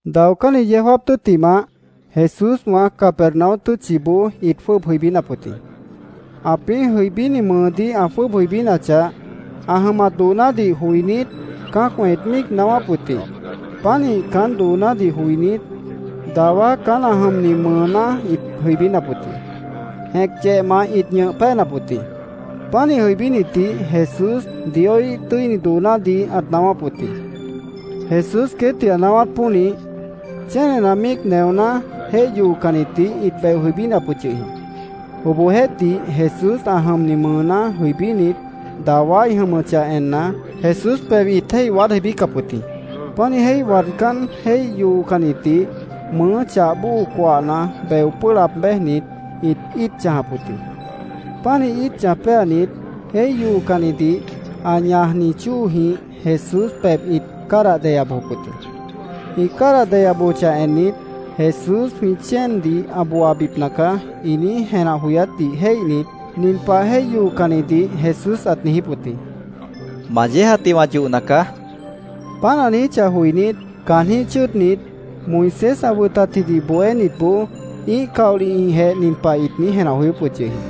Daocánni yeó jáap tʉ́ttimah, Jesúswã Capernaum tʉ́tchiboó ĩt jwʉ́ʉb jʉibínap wʉt jĩ. Ãpĩ́ jʉibíni mʉʉdíh ã jwʉ́ʉb jʉibínachah, ã jʉmat doonádih joinít, cã́acwã ĩt míic naáwáp wʉt jĩ. Pánih caán doonádih joinít, dawá caán ã jʉmni mʉʉná ĩt jʉibínap wʉt jĩ. Jẽc yehmant ĩt ñʉh péenap wʉt jĩ. Pánih jʉibínitdih Jesús Dioíh tʉ́ini doonádih ãt naáwáp wʉt jĩ. Jesús queétdih ã naáwát pónih, chénena míic neoná jéih yoocannidih ĩt beo jʉibínap wʉt yʉh jĩ. Obohjeéhtih, Jesús ã jʉmni mʉʉná jʉibínit, dawá ĩ jʉmʉchah enna, Jesús pebh ĩt jéih waád jʉibícap wʉt jĩ. Pánih jéih waadcán, jéih yoocannidih mʉʉ́ chah bóo coahna beo pʉ́ʉh laab béjnit, ĩt íit chãjap wʉt jĩ. Pánih íit chãj péanit, jéih yoocannidih ã ñajni chóojĩh Jesús pebh ĩt cádah deya bojop wʉt jĩ. Ĩ cádah deya bojochah ennit, “Jesús jwĩ chéendih ã booabipna caá”, ĩ niíj jenah joyátdih jéihnit, nin pah jéih yoocannidih Jesús ãt niijíp wʉt jĩ: —Ma yéejatdih wã yohna caá, ãt niijíp wʉt jĩ. Páant ã niijíchah joinít, caanjĩ́h chʉ́ʉdnit Moisés ã wʉtatjidih bohénitboó ĩ́ih caolihjĩhjeh nin pah ĩt niíj jenah joyóp wʉt yʉh jĩ: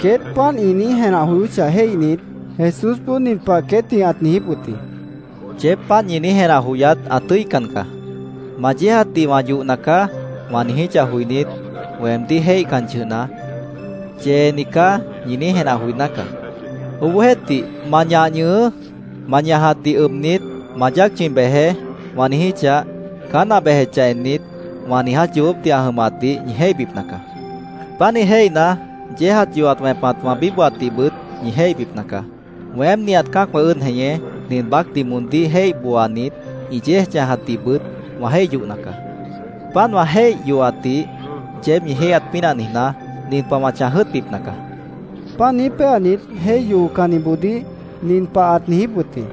Queét páant ĩ niíj jenah joyóchah jéihnit, Jesúsboó nin pah queétdih ãt niijíp wʉt jĩ: —Yeéb páant ñi niíj jenah joyát ã tʉ́ican caá. ‘Ma yéejatdih wã yohna caá’, wã niijíchah joinít, weemdíh jéihcan yʉhna, ‘Yeeni caá’, ñi niíj jenah joiná caá. Obohjeéhtih, ‘Ma ñah ñʉhʉʉ́. Ma ñajatdih ʉbnit, ma yáac chʉ̃i bejeé’, wã niijíchah, caán ã bejechah ennit, wã niiját yoobópdih ã jʉmatdih ñi jéihbipna caá. Pánih jéihna, yéejat yohat wẽpat wã bíbohatdihbʉt ñi jéihbipna caá. Weém nihat cã́acwã ʉ́ʉd jeñé, nin baácdih moondíh jéih booanit, ĩ yéej chãjatdihbʉt wã jéih yohna caá. Páant wã jéih yohatdih yeéb ñi jéihyat pínah niijná, nin pah wã chãj jʉ́ʉtbipna caá, ãt niijíp wʉt jĩ. Páant niíj péanit, jéih yoocanniboodíh nin pah ãt niijíp wʉt jĩ: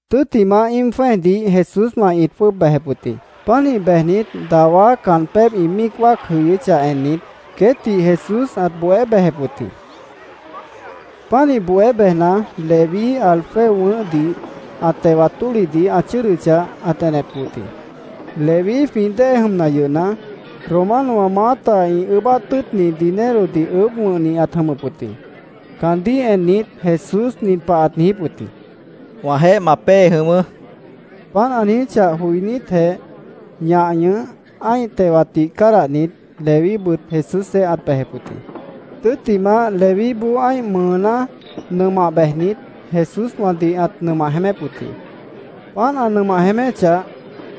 Tʉ́ttimah, íim jwẽ́ejdih Jesúswã ĩt jwʉ́ʉb bejep wʉt jĩ. Pánih bejnit, dawá caan pébh ĩ míic wáac jʉyʉ́chah ennit, queétdih Jesús ãt bohé bejep wʉt jĩ. Pánih bohé bejna, Leví Alfeo wʉ̃ʉ́hdih ã tewat tólihdih ã chʉ́ʉdʉchah, ãt enep wʉt jĩ. Leví, jwĩ dée jʉmna yʉhna, Romanowã maáta ĩ ʉʉ́bát tʉ́ʉtni dinerodih ʉʉ́bh wʉ̃hni ãt jʉmʉp wʉt jĩ. Caandíh ennit, Jesús nin pah ãt niijíp wʉt jĩ: —Wãjeéh ma pée jʉ̃ʉ́wʉ́, ãt niijíp wʉt jĩ. Páant ã niijíchah joinítjeh, ñah ñʉh, ã́ih tewatdih cádahnit, Levíbʉt Jesúsjeéh ãt bejep wʉt jĩ. Tʉ́ttimah, Levíboó ã́ih mʉʉná nʉmah bejnit, Jesúswãdih ãt nʉmah jeémép wʉt jĩ. Páant ã nʉmah jeéméchah,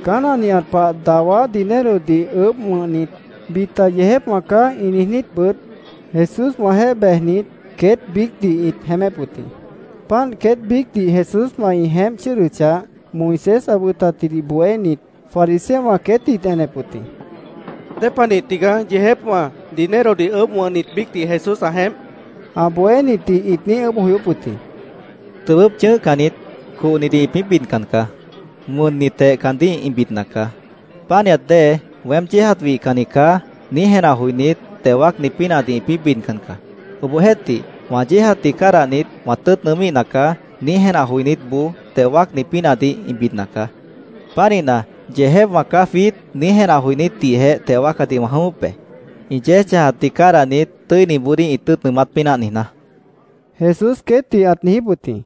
caán ã nihat pah dawá dinerodih ʉʉ́bh wʉ̃hnit, bita “Yeejépwã caá”, ĩ niijnítbʉt, Jesúswãjeéh bejnit, queét biícdih ĩt jeémép wʉt jĩ. Páant queét biícdih Jesúswã ĩ jeémp chʉ́ʉdʉchah, Moisés ã wʉtatjidih bohénit fariseowã queétdih ĩt enep wʉt jĩ. —¿Dépanih tigaá yeejépwã, dinerodih ʉʉ́bh wʉ̃hnit biícdih Jesús ã jeémp? ã bohénitdih ĩt niíj ʉʉ́bh joyóp wʉt jĩ. —Tʉbʉ́p chʉ̃ʉ́hcannit cohnidih ĩpĩ́ bidcan caá. Wʉnnitjeh caandíh ĩ bidna caá. Pánihat dée ‘Weém yéejat wihcanni caá’, niíj jenah joinít, teo wáacni pínahdih ĩpĩ́ bidcan caá. Obohjeéhtih, ‘Wã yéejatdih cádahnit, wã tʉ́ʉt nʉʉ́míhna caá’, niíj jenah joinítboó teo wáacni pínahdih ĩ bidna caá. Pánihna, ‘Yeejépwã caá jwiít’, niíj jenah joinítdihjeh teo wáacadih wã jʉ̃ʉ́wʉ́p be, ĩ yéej chãjatdih cádahnit, tʉ́iniboodíh ĩ tʉ́ʉt nʉʉmát pínah niijná, Jesús queétdih ãt niijíp wʉt jĩ.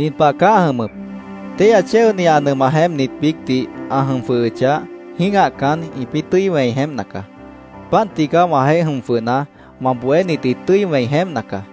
—Nin pah caá ã jʉmʉp: Téihya chéoni ã nʉmah jeémpnit biícdih ã jʉm jwʉhʉchah, jĩ́gahcan, ĩpĩ́ tʉ́i wẽi jeémpna caá. Páant tigaá, wãjeéh jʉm jwʉhna, wã bohénit ĩ tʉ́i wẽi jeémpna caá.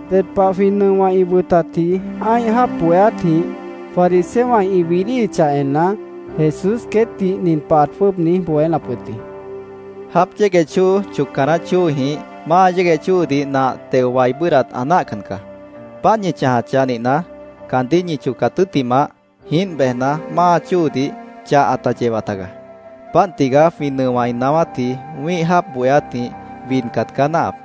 Ded pah jwĩ nʉowã ĩ wʉtatji ã́ih jáap bohéátjĩh fariseowã ĩ widíhichah enna, Jesús queétdih nin pah ãt jwʉ́ʉb niíj bohénap wʉt jĩ: “Jáap yégueh chóo chocca naáh chóojĩh máa yégueh chóodih nah teo wai bʉ́ʉdhdat ã náahcan caá. Páant ñi chãjachah nihna, caandíh ñi chocat tʉ́ttimah, jiínt bejna, máa chóodih chah ãta yewa tagaá. Páant tigaá jwĩ nʉowã ĩ naáwátji wĩ́ih jáap bohéátjĩh widcat caá náahap.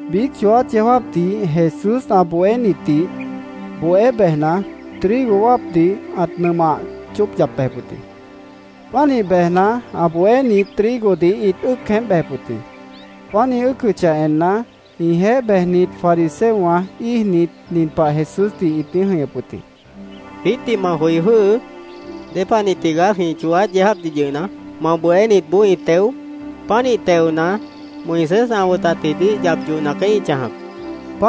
Biíc chooát yeó jáapdih Jesús ã bohénitdih bohé bejna, trigo wáapdih ãt nʉmah chóop yap bejep wʉt jĩ. Pánih bejna, ã bohénit trigodih ĩt ʉ́ʉc jeémp bejep wʉt jĩ. Páant ĩ ʉ́ʉcʉchah enna, ĩjeéh bejnit fariseowã íijnit, nin pah Jesúsdih ĩt niíj jʉ̃ihñʉp wʉt jĩ: —Jwiítdih ma joi jwʉ́hʉʉ́. ¿Dépanih tigaá jwĩ chooát yeó jáapdih yʉhna, ma bohénitboó ĩ teo? Pánih teona, Moisés ã wʉtatjidih yap yohna caá ĩ chãjap, ĩt niijíp wʉt jĩ.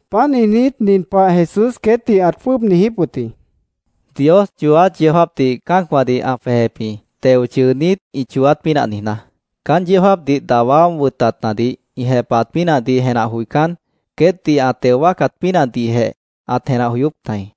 Páant niijnít, nin pah Jesús queétdih ãt jwʉ́ʉb niijíp wʉt jĩ: —Dios chooát yeó jáapdih cã́acwãdih ã jwejep jĩ, teo chʉʉnít, ĩ chooát pínah niijná. Caán yeó jáapdih dawá wʉtatnadih ĩ jepahat pínahdih jenah joicán, queétdih ã teo wáacat pínahdihjeh ãt jenah joyóp tajĩ.